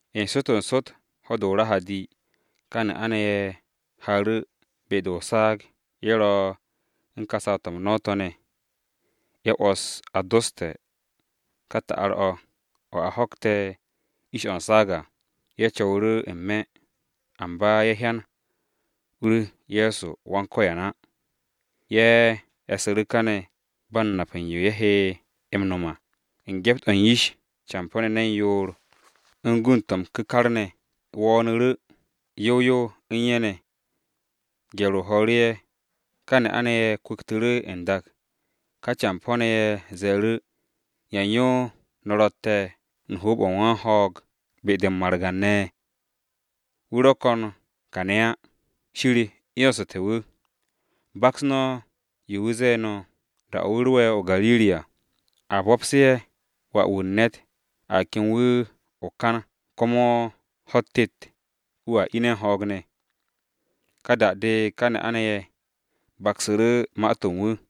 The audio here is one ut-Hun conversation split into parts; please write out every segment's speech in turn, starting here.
N-sot, n-sot, ho̱-de o-Rahadi, ka ne'a-ne̱ ye̱ haaru̱ be-de o-saag, ye̱ ro u̱n ka saw-to̱ m-no̱w to̱ ne̱. Ye̱ 'wo̱s a doste̱ ka ta'ar-o̱, o̱ a ho̱kte̱ ish-o̱ u̱n saag à, Ye̱ co̱wu̱ru̱ n-me̱, amba ye̱ hyan u-u̱r Ye̱so Go̱s-wu̱ á. Ye̱ e̱su̱ru̱ kane̱ ba u̱n nap u̱n yo ye̱ he m-no̱m á, u̱n gyept-o̱ u̱n yish campo̱-ne̱ ne̱n yoor u̱n gund-to̱ m-ku̱kar ne̱ wo̱o̱nu̱ru̱ yow yow u̱n ye̱ ne̱. Gye̱r-o ho̱o̱ru̱ ye̱, ka ne'a-ne̱ ye̱ kwu̱ktu̱ru̱ n-dak. Ka campo̱-ne̱ ye̱ ze̱e̱ru̱, “¿Yan yo no̱ ro̱tte̱ u̱n hoob-o̱ u̱n wan-ho̱o̱g be-de u̱n margan-ne̱? Wu̱ ro̱ ko̱n kane̱ á, Shir 'yonsu̱te̱ wu̱. Baks no̱ yo wu̱ zee no̱ da-o̱ wu̱ ro'e̱ o-Gariri à. A bo̱pse̱ ya-u̱r-ba'as ‘Wà-wu̱ u̱n ne̱t a kem wu̱ o-kan komo ho̱-u̱t tet wu̱a ine̱ u̱n ho̱o̱g ne̱.’” Ka da-de ka ne'a-ne̱ ye̱ baksu̱ru̱ ma-to̱ u̱n wu̱.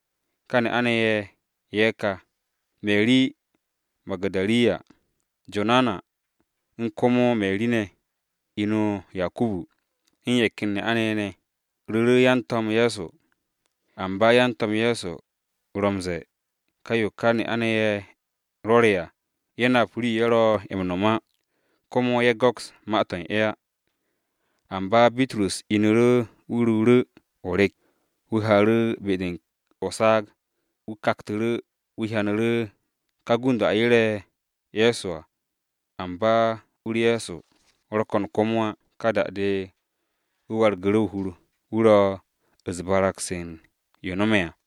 Ka ne'a-ne̱ ye̱ ka, Meri Magu̱darin, Jonana, u̱n komo Meri ne̱ (inu Yakubu), u̱n ye̱ ken ne'a-ne̱ ye̱ ne̱, ru̱ru̱ yan-To̱m Ye̱so. Amba yan-To̱m Ye̱so ro̱ m-ze̱e̱ ka yo ka ne'a-ne̱ ye̱ rwo̱re̱ à ye̱ nap rii-yo ye̱ ro̱ m-no̱m á, komo ye̱ go̱ks ma-to̱ u̱n ye̱ á. Amba Bitrus inu̱ru̱ wu̱ ruuru̱ o-rek wu̱ haaru̱ be-de o-saag. Wu̱ kaktu̱ru̱, wu̱ hyanu̱ru̱ ka gund-o̱ a yere̱ Ye̱so à, amba u-u̱r Ye̱so ro̱ ko̱n komo á. Ka da-de wu̱ wargu̱ru̱ o-hur, wu̱ ro̱ u̱s-barag-se u̱n yo no̱me̱ à.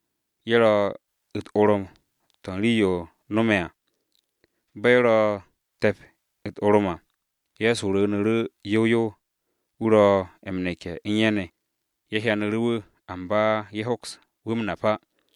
Ye̱ ro̱ u̱t-orom to̱ u̱n rii-yo no̱me̱ à. Bo̱ ye̱ ro̱ te̱p u̱t-orom à, Ye̱so wo̱o̱nu̱ru̱ yow yow wu̱ ro̱ m-neke̱ u̱n ye̱ ne̱. Ye̱ hyanu̱ru̱ wu̱, amba ye̱ hoks wu̱ m-nap á.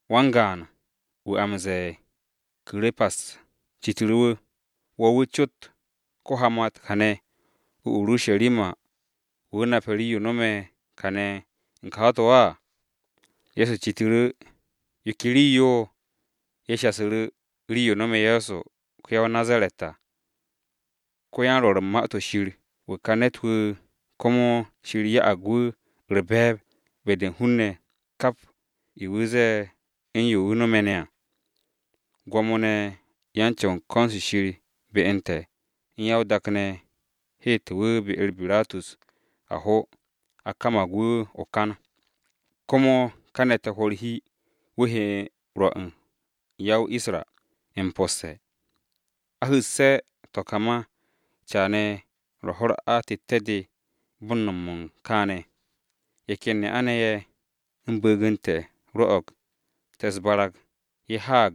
Wan-gaan-wu̱ a m-ze̱e̱ Ku̱repas, citu̱ru̱ wu̱, “Wo̱ wu̱ cot ko-hamat kane̱ o-Urusharima, wu̱ nape̱ rii-yo no̱me̱ kane̱ u̱n ka ho̱-to̱ á.” Ye̱so citu̱ru̱, “¿Yo ke rii-yo?” Ye̱ shasu̱ru̱, “Rii-yo no̱me̱ Ye̱so ko-ya-o-Nazaret à. Ko-yan-Rwo̱ru̱ u̱n Ma-to̱ Shir wu̱ ka ne̱t-wu̱, komo Shir ya'ag wu̱ u̱r-be̱e̱b be-de u̱n hun-ne̱, kap yo wu̱ zee, u̱n yo wu̱ no̱me̱ ne̱ à. Gwo̱mo-ne̱ ye̱ u̱n ko̱n-se Shir be u̱n te̱, u̱n ya-o-dak-ne̱ heete̱ wu̱ be-u̱r Biratus a ho, a kamag wu̱ o-kan. Komo kane̱ te̱ hwo̱ u̱r-hur, wu̱ he rwo̱ u̱n ya-o-Isra m-posse̱. A hu̱sse̱ to̱ ka ma, caane̱ ro̱ ho̱-u̱r atette̱-de bo̱ u̱n no̱m u̱n kaane̱. Ye̱ ken ne'a-ne̱ ye̱, u̱n bu̱u̱g u̱n te̱ rwo̱'o̱g te̱ u̱s-barag, ye̱ haag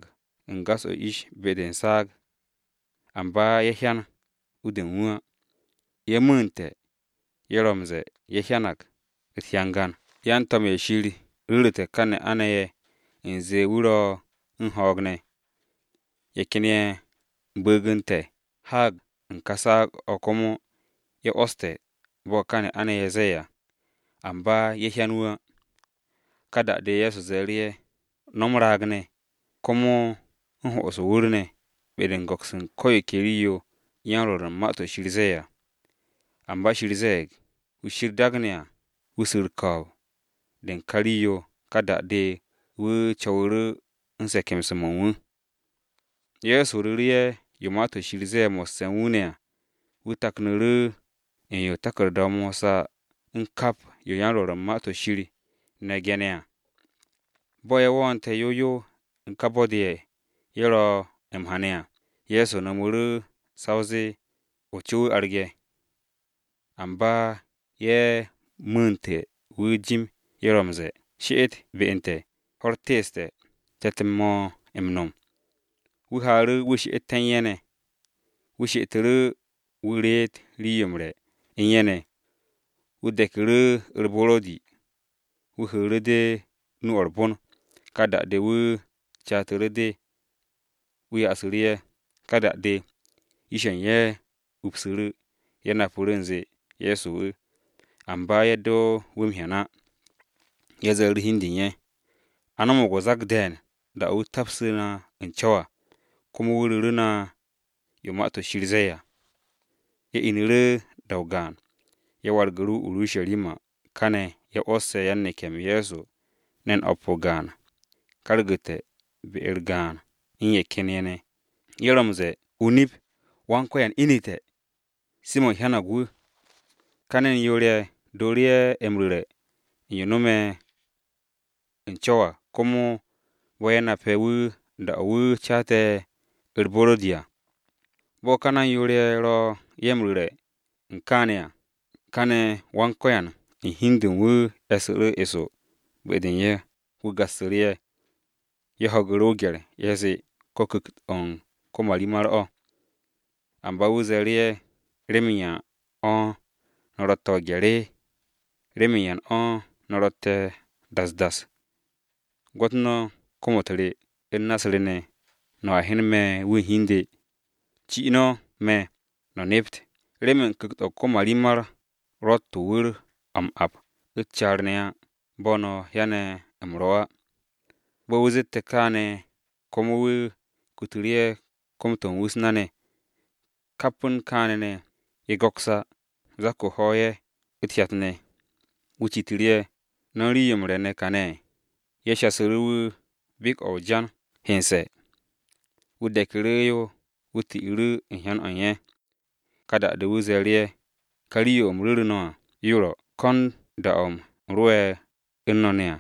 u̱n gas-o ish be-de u̱n saag. Amba ye̱ hyan u-de u̱n wu̱ á. Ye̱ mu̱u̱nte̱, ye̱ ro̱ m-ze̱e̱ ye̱ hyanag u̱t-hyangan yan-to̱m-ye̱ Shir ru̱ru̱te̱ ka ne'a-ne̱ ye̱ u̱nze wu̱ ro̱ u̱n ho̱o̱g ne̱. Ye̱ ken ye̱ u̱n bu̱u̱g u̱n te̱ haag u̱n ka saag-o̱ komo ye̱ 'wo̱ste̱ bo̱ ka ne'a-ne̱ ye̱ ze̱e̱ à, amba ye̱ hyan wu̱ á.” Ka da-de Ye̱so ze̱e̱ru̱ ye̱, “No̱ m-raag ne̱, komo u̱n ho'os o-wu̱r ne̱ be-de u̱n go̱ks u̱n ko̱ yo ke yo yan-Rwo̱ru̱ u̱n Ma-to̱ Shir zee à! Amba Shir ze̱e̱g Kiristi wu̱ su̱ u̱r-ko̱o̱b de u̱n ka rii-yo, ka da-de wu̱ co̱wu̱ru̱ u̱n se̱ke̱mse̱-mo̱ u̱n wu̱.” Ye̱so ru̱ru̱ ye̱ yo Ma-to̱ Shir zee mo̱sse̱ u̱n wu̱ ne̱ à, wu̱ taknu̱ru̱ u̱n yo taku̱rda-o Mosa u̱n kap yo yan-Rwo̱ru̱ u̱n Ma-to̱ Shir ne̱ ge̱ne̱ à. Bo̱ ye̱ wo̱o̱nte̱ yow yow u̱n ka bo̱-de ye̱ ro̱ m-ha ne̱ à, Ye̱so no̱mu̱ru̱ sa o zee o-co wu̱ arge̱. Amba ye̱ mu̱u̱ntu̱ wu̱ jim ye̱ ro̱ m-ze̱e̱, “She'et be u̱n te̱, ho̱-u̱r teeste̱ te̱t-m mo̱ m-no̱m.” Wu̱ haaru̱ wu̱ she'ete̱ u̱n ye̱ ne̱. Wu̱ she'etu̱ru̱ wu̱ reet rii-yo m-re̱ u̱n ye̱ ne̱, wu̱ deku̱ru̱ u̱r-buro̱di, wu̱ hu̱u̱ru̱ de nu-o̱ u̱r-bon, ka da-de wu̱ catu̱ru̱ de wu̱ yasu̱ru̱ ye̱. Ka da-de yish-ye̱ u̱n ye̱ upsu̱ru̱, ye̱ napu̱ru̱, u̱nze Ye̱so wu̱, amba ye̱ do wu̱ m-hyan á. Ye̱ ze̱e̱ru̱ hi u̱n de u̱n ye̱, “A no̱mo̱g o-zak de̱e̱n da-o̱ wu̱ te̱psu̱ na u̱n co̱w à, komo wu̱ ru̱ru̱ na yo Ma-to̱ Shir zee à.” Ye̱ inu̱ru̱ da-o gaan, ye̱ wargu̱ru̱ o-Urusharima. Kane̱ ye̱ 'wo̱sse̱ yan-neke̱-m Ye̱so ne̱n o̱p o-gaan kargu̱te̱ be-u̱r gaan u̱n ye̱ ken ye̱ ne̱ ye̱ ro̱ m-ze̱e̱, “Nip-o̱ Go̱s-wu̱ inu̱te̱! Simo̱n hyanag wu̱!” Ka ne̱n yoor-ye̱, dooru̱ ye̱ m-ru̱re̱ u̱n yo no̱me̱ u̱n co̱w à, komo bo̱ ye̱ nape̱ wu̱ da-o wu̱ caate̱ u̱r-buro̱di à. Bo̱ ka ne̱n yoor-ye̱ ro ye̱ m-ru̱re̱ kaane̱ à, kane̱ Go̱s-wu̱ u̱n hi u̱n de u̱n wu̱ e̱su̱ru̱ eso be-de u̱n ye̱. Wu̱ gassu̱ru̱ ye̱. Ye̱ ho̱gu̱ru̱ o-gye̱r, ye̱ zee ko̱ ku̱kt-o̱ u̱n ko-marimar o̱. Amba wu̱ ze̱e̱ru̱ ye̱, “¿Remen yan o̱ no̱ ro̱tte̱ o-gye̱r? ¿Remen yan o̱ no̱ ro̱tte̱ das das? Gwo̱t no̱ kom-u̱t re u̱n na-u̱s re ne̱, no̱a hyen me̱ wu̱ u̱n hi u̱n de. Ci no̱ me̱, no̱ nept, remen ku̱kt-o̱ u̱n ko-marimar ro̱tt to̱ wu̱r-o̱ m-ap u̱t-caar ne̱ á, bo̱ no̱ hyane̱ u̱m ro̱ à.” Bo̱ wu̱ zette̱ kaane̱, komo wu̱ kutu̱ru̱ ye̱ kom-to̱ u̱n wu̱ u̱s-na ne̱. Kap u̱n kaane̱ ne̱ ye̱ go̱ks á, zak-o ho̱o̱g ye̱, u̱t-hyat ne̱. Wu̱ citu̱ru̱ ye̱, “¿No̱ u̱n rii-yo m-re̱ ne̱ kane̱?” Ye̱ yasu̱ru̱ wu̱ bek-o̱ o-jan hense̱. Wu̱ de̱ku̱ru̱ yo wu̱ ti'u̱ru̱ u̱n hyan-o u̱n ye̱. Ka da-de wu̱ ze̱e̱ru̱ ye̱, “Ka rii-yo u̱m ru̱ru̱ no̱ à, yo ro kon da-o̱ u̱m ro̱'e̱ u̱n no̱ ne̱ à: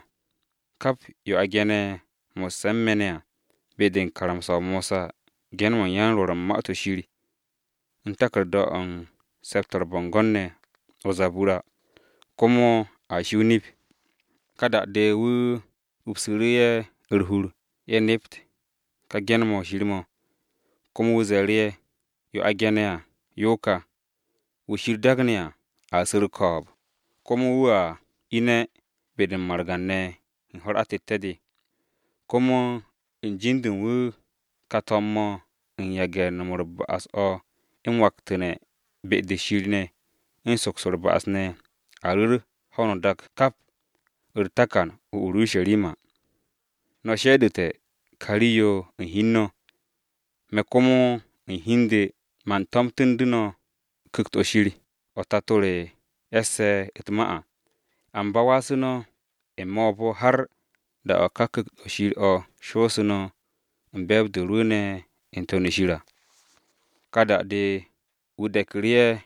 Kap yo a ge̱ne̱ mo̱sse̱ u̱n me̱ ne̱ à, be-de u̱n karamsa-o Mosa, ge̱n-mo̱ u̱n yan-Rwo̱ru̱ u̱n Ma-to̱ Shir, u̱n taku̱rda-o̱ u̱n Se̱p-to̱ u̱r-Bo̱ngo̱n ne̱ komo, a shi o-nip.” Ka da-de wu̱ upsu̱ru̱ ye̱ u̱r-hur, ye̱ nept ka ge̱n-mo̱ Shir mo̱. Komo wu̱ ze̱e̱ru̱ ye̱, “Yo a ge̱ne̱ à yo ka: Kiristi a su̱ u̱r-ko̱o̱b, komo wu̱a ine̱ be-de u̱n margan-ne̱ u̱n ho̱-u̱r atette̱-de. Komo u̱n jin-de u̱n wu̱, ka to̱m-mo̱ u̱n yage̱ u̱n no̱m u̱r-ba'as o̱ m-waktu̱ne̱ be-de Shir ne̱, u̱n soks u̱r-ba'as ne̱, a ru̱r o̱ ho̱no o-dak kap, u̱r-takan o-Urusharima. No̱ ro̱ ya-m-su̱'e̱ u̱n ka rii-yo u̱n hi u̱n no̱. Me̱ komo u̱n hi u̱n de man tomtu̱ndu̱ no̱ ku̱kt-o Shir, o̱ Tato re e̱sse̱ u̱t-ma à. Amba wasu̱ no̱ n-me̱ o-bo̱ har da-o̱ ka ku̱kt-o Shir o̱ shoosu̱ no̱ u̱n be̱e̱b-de rwu̱u̱ne̱ n-To̱n u̱n shir à.” Ka da-de wu̱ de̱ku̱ru̱ ye̱,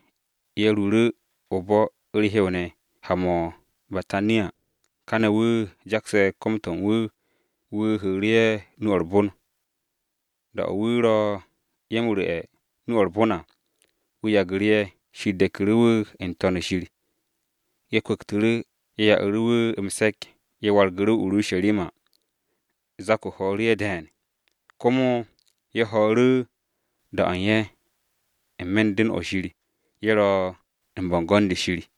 ye̱ ruuru̱ o-bo̱ u̱r-hew ne̱ ha-mo̱ o-Betanya. Kane̱ wu̱ jakse̱ kom-to̱ u̱n wu̱, wu̱ hu̱u̱ru̱ ye̱ nu-o̱ u̱r-bon. Da-o̱ wu̱ ro̱ ye̱ u̱n ru̱'e̱ u̱n nu-o̱ u̱r-bon à, wu̱ yagu̱ru̱ ye̱. Shir de̱ku̱ru̱ wu̱ n-To̱n u̱n shir. Ye̱ kwu̱ktu̱ru̱, ye̱ ya'u̱ru̱ wu̱ m-se̱k, ye̱ wargu̱ru̱ o-Urusharima. Zak-o ho̱o̱ru̱ ye̱ de̱e̱n. Komo ye̱ ho̱o̱ru̱ da-o̱ u̱n ye̱, n-me̱ u̱n Pyo-o̱ Shir, ye̱ ro̱ u̱n bo̱ngo̱n-de Shir.